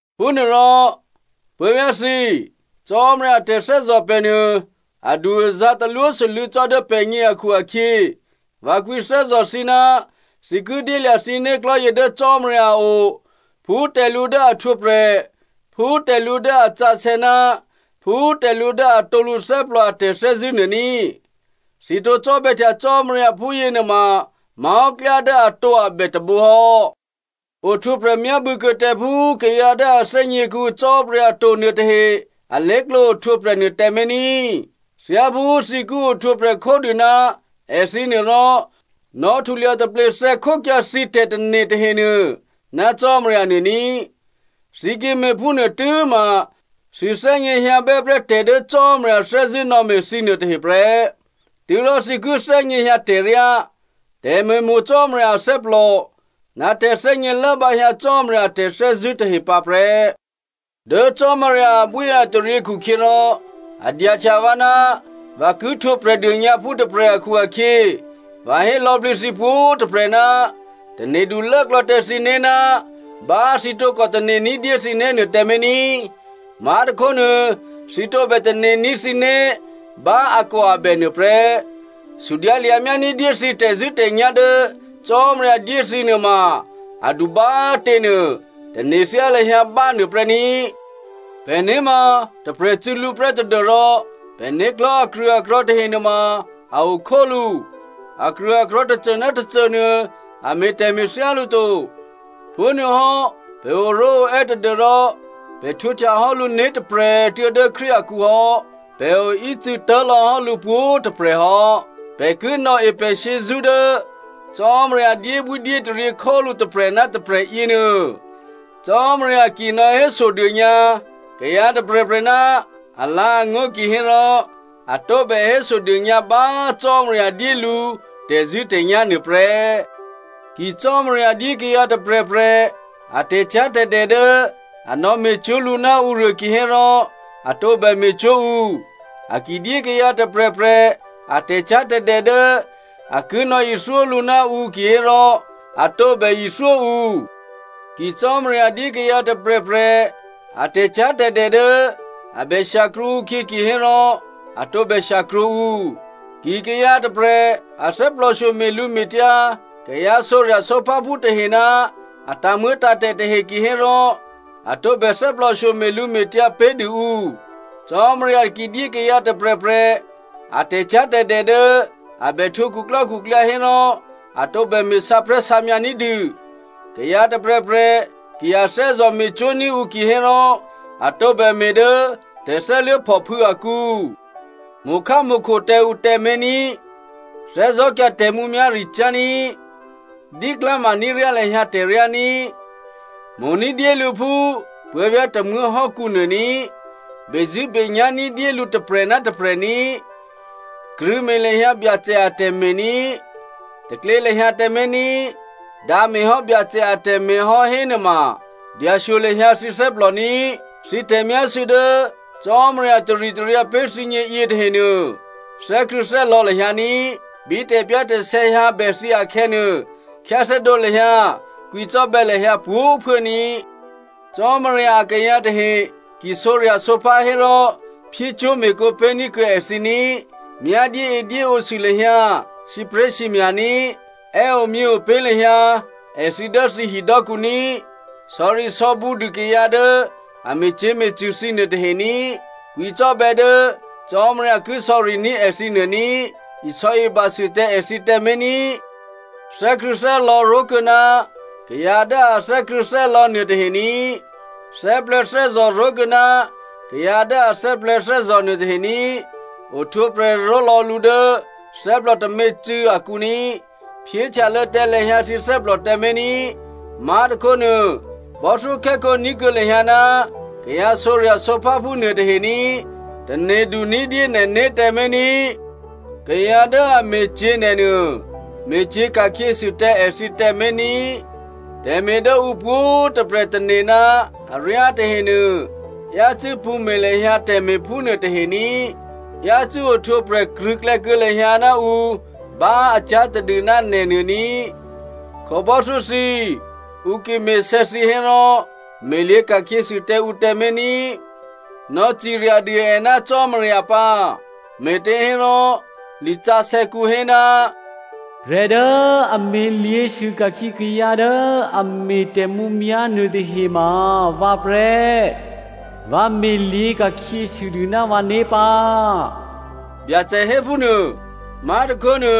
Phúnuôrò, puố̤vyá̤ thǐ꤮, Cò́marya a tè̤thè́zò̤ pè̤ nuô, adu-azǎ̤ talwósû́lû̌ cò́ dố pè̤gně akhu-akhyě, vǎ kwǐthè́zò̤ thǐ ná thǐ ki dyélya̤ thǐ né̤klò̤́ yě dố Cò́marya a o phú tè̤lǔ dố a htwǒprè̤, phú tè̤lǔ dố a sǎsè̌ ná phú tè̤lǔ dố atǒ lǔthè́plò a tè̤thè́zṳ̂́ nuô ní꤮. Thǐ tǒ cò́bè̌htya Cò́marya phúyěnuôma má̤hò́ klyá dố atǒabè tôbǒ hò́. Ohtwǒprè̤ myábû̌kuô̌ tǎ phú kayǎ dố a thè́gně kuô̌ǔ Cò́marya to nuôtahe alé̤klǒ ohtwǒprè̤ nuôtǎmé̤ ní꤮. Thyáphú thǐ ki ohtwǒprè̤ khódû ná èthǐnuô rò, nò̌htulya taplethè̌ khókyǎ thǐ tè̤tane̤ tahenuô ná Cò́marya nuô ní꤮. Thǐ ki me̤phúnuô tû́ma thǐ thè́gněhyǎbè́ prè́ tè̤ dố Cò́marya thè́zṳ̂́ nò̌me̤ thǐnuô tahe prè́. Tû́rò thǐ ki thè́gněhyǎ tè̤ryá, tè̤me̤mo̤ Cò́marya athè́plò, ná tè̤thè́gně lốbǎhyǎ Cò́marya a tè̤thè́zṳ̂́ tahe pǎ prè́. Dố Cò́marya abwíataryě khukhyěrò a dyahtya vǎ ná vǎ ki htwǒ Prè̤dônyǎphú tôprè̤ akhu-akhyě, vǎ hé lò̌plǐ thǐ pwǒ̤꤮ tôprè̤, tane̤du lốklò̌ tǎ thǐné̤ ná bá thǐ tǒkò tane̤ ní̤dyé thǐné̤nuô tǎmé̤ ní꤮. Má̤tôkhónuô thǐ tǒbè tane̤ní̤ thǐné̤ bá akòabè nuôprè́. Sudyǎ lya̤myá ní̤dyé thǐ tè̤zṳ̂́tè̤nyá̤ dố Cò́marya dyé thǐ nuôma adu bá꤮ těnuô tane̤thyá lahyǎ bánuôprè́ ní꤮. Pè̤né̤ ma tôprè̤ cû̌ lǔ prè́ tadû́rò pè̤né̤klò̤́ akrṳ̂akrò̤̌ tahe nuôma a okhólǔ. Akrṳ̂akrò̤̌ tôcô ná tôcô nuô, a me̤ tè̤me̤ thyálǔ to. Phúnuôhò́ pè̤ oró̤oè́ tadû́rò pè̤ htwǒhtyahò́ lǔ né̤tôprè̤꤮ tuô̌ dố Krístu akǔhò́. Pè̤ oícû̌tố̤ lò̌hò́ lǔ pwǒ̤꤮ tôprè̤hò́. Pè̤ ki nò̌e pè̤ shyězṳ́ dố Cò́marya dyébwí dyétaryě khólǔ tôprè̤ ná tôprè̤ yěnuô. Cò́marya ki nò̌hésodônyǎ kayǎ tôprè̤prè̤ ná alǎ̤angó̤ kihérò, a tǒbè hésodônyǎ bá Cò́marya dyé lǔ tè̤zṳ̂́tè̤nyá̤ nuôprè́. Ki Cò́marya dyé kayǎ tôprè̤prè̤ a tè̤cyá̤tè̤dè dố a nò̌me̤cwó̤ lǔ ná ǔruô kihérò, a tǒbè me̤cwó̤ ǔ. A ki dyé kayǎ tôprè̤prè̤ a tè̤cyá̤tè̤dè dố a ki nò̌ithyó lǔ ná ǔ kihérò, a tǒbè ithyó ǔ. Ki Cò́marya dyé kayǎ tôprè̤prè̤ a tè̤cyá̤tè̤dè dố a bè shyakrwǒ ǔkhyě kihérò a tǒbè shyakrwǒ ǔ. Ki kayǎ tôprè̤ a thè́plòshyo me̤lǔme̤tyǎ kayǎ sǒrya̤sǒpháphú tahe ná a tǎ̤muô̌tǎ̤tè̤ tahe kihérò a tǒbè thè́plòshyo me̤lǔme̤tyǎ pé̤dû ǔ. Cò́marya ki dyé kayǎ tôprè̤prè̤ a tè̤cyá̤tè̤dè dố a bè htwǒ khuklò́khuklyǎ hérò a tǒbè me̤ sǎprè̤́sǎmyǎ ní̤dû. Kayǎ tôprè̤prè̤ ki a thè́zò̤ me̤cwó̤ní̤ ǔ kihérò, a tǒbè me̤ dố tè̤thè́luố̤phòphû̌ akǔ. Mo̤khámo̤kho tǎ ǔ tǎmé̤ ní꤮. Thè́zò̤́kyǎ tè̤mǔmyá̤ricyá̤ ní꤮. Díklá̤ maní̤ryá lahyǎ tè̤ryá ní꤮. Mo̤ ní̤dyé lǔ phú puố̤vyá̤ tômuố̤ hò́kǔnuô ní꤮. Bezṳ̂́benyá̤ ní̤dyé lǔ tôprè̤ ná tôprè̤ ní꤮. Krṳ̂̌me̤ lahyǎ Byacè atè̤me̤ ní꤮. Taklě lahyǎ tǎmé̤ ní꤮. Dǎ me̤hò́ Byacè atè̤me̤ hò́ hénuôma dyashyo lahyǎ thǐ thè́plò ní꤮. Thǐ tè̤myásû̌ dố Cò́marya taritaryǎ pé̤ thǐgně yětahenuô, thè́krṳ̂̌thè́lò̌ lahyǎ ní꤮. Bí tè̤pyá̤tè̤sè̌ hyǎbè thǐ akhè̌nuô, khyáthè́dǒ lahyǎ, kwǐcò́bè̌ lahyǎ pwǒ̤꤮ phuố ní꤮. Cò́marya akayǎ tahe ki sǒrya̤sǒphá hérò, me̤cwó̤me̤kǒ pé̤ní̤ kuô̌ èthǐ ní꤮. Myá dyéedyéǒsû lahyǎ sǐpré̤sǐmya̤ ní꤮. È́ omyě opé̤ lahyǎ èthǐ dố thǐ hidò́kǔ ní꤮. Sò̌risò̌bǔ dû kayǎ dố a me̤cyě̤me̤cṳ̂ thǐ nuôtahe ní꤮. Kwǐcò́bè̌ dố Cò́marya ki sò̌riní̤ èthǐ nuô ní꤮, isò̌ibasû tǎ èthǐ tǎmé̤ ní꤮. Thè́krṳ̂̌thè́lò̌ ró̤kuô̌ ná kayǎ dố a thè́krṳ̂̌thè́lò̌ nuôtahe ní꤮. Thè́plè̤̌thè́zò̤ ró̤kuô̌ ná kayǎ dố a thè́plè̤̌thè́zò̤ nuôtahe ní꤮. Ohtwǒprè̤ ró̤lò̌ lǔ dố thè́plò tômě꤮ cû̌ akǔ ní꤮. Phyéhtyalô̌ tǎ lahyǎ thǐ thè́plò tǎmé̤ ní꤮. Má̤tôkhónuô, bò́thyókhè́khǒ ní̤kuô̌ lahyǎ ná kayǎ sǒrya̤sǒpháphú nuôtahe ní꤮. Tane̤du ní̤dyé nè̤né̤ tǎmé̤ ní꤮. Kayǎ dố a me̤cyě̤ nè̤ nuô, me̤cyě̤ ka̤khyěsû tǎ èthǐ tǎmé̤ ní꤮. Tè̤me̤ dố ǔ pwǒ̤꤮ tôprè̤ tane̤ ná aryá tahenuô, yácû́ pṳ̌me̤ lahyǎ tè̤me̤ phúnuô tahe ní꤮. Yácû́ ohtwǒprè̤ krṳ̂̌klè̌ kuô̌ lahyǎ ná ǔ bá a cyá̤ tadû ná nè̤nuô ní꤮. Khǒbò́thyó thǐ, ǔ ki me̤sè̌ thǐ hérò, me̤lyě̤ ka̤khyěsû tǎ ǔ tǎmé̤ ní꤮. Nò̌ciryadû è ná Cò́marya pǎ, me̤těhérò lisǎsè̌kǔ hé, “Prè̤ dố a me̤lyě̤sû ka̤khyě kayǎ dố a me̤ tè̤mǔmyá̤ nuôtahe ma vǎ prè́. Vǎ me̤lyě̤ ka̤khyěsûdû ná vǎné̤ pǎ,” Byacè hé phúnuô. Má̤tôkhónuô,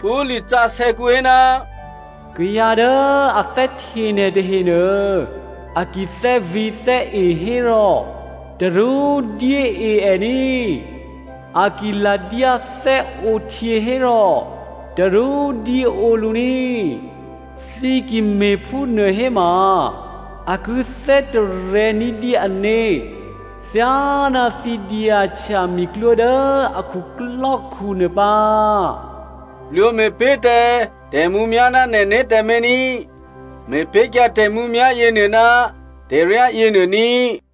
phú lisǎsè̌kǔ hé, “Kayǎ dố a thè́hte nè̤ tahenuô, a ki thè́vǐ̤thè́e hérò, tarú dyée è ní꤮. A ki ladyá thè́ǒhtyě hérò, tarú dyéǒ lǔ ní, thǐ ki me̤phúnuô héma, a ki thè́tarè̤̌ ní̤dyé ané̤ thyáná thǐ dyahtya miklwó dố a khuklò́khu nuô pǎ.” Plwǒ me̤pé̤ tǎ tè̤mǔmyá̤ ná nè̤né̤ tǎmé̤ ní꤮. Me̤pé̤kyǎ tè̤mǔmyá̤ yěnuô ná tè̤ryá yěnuô ní꤮.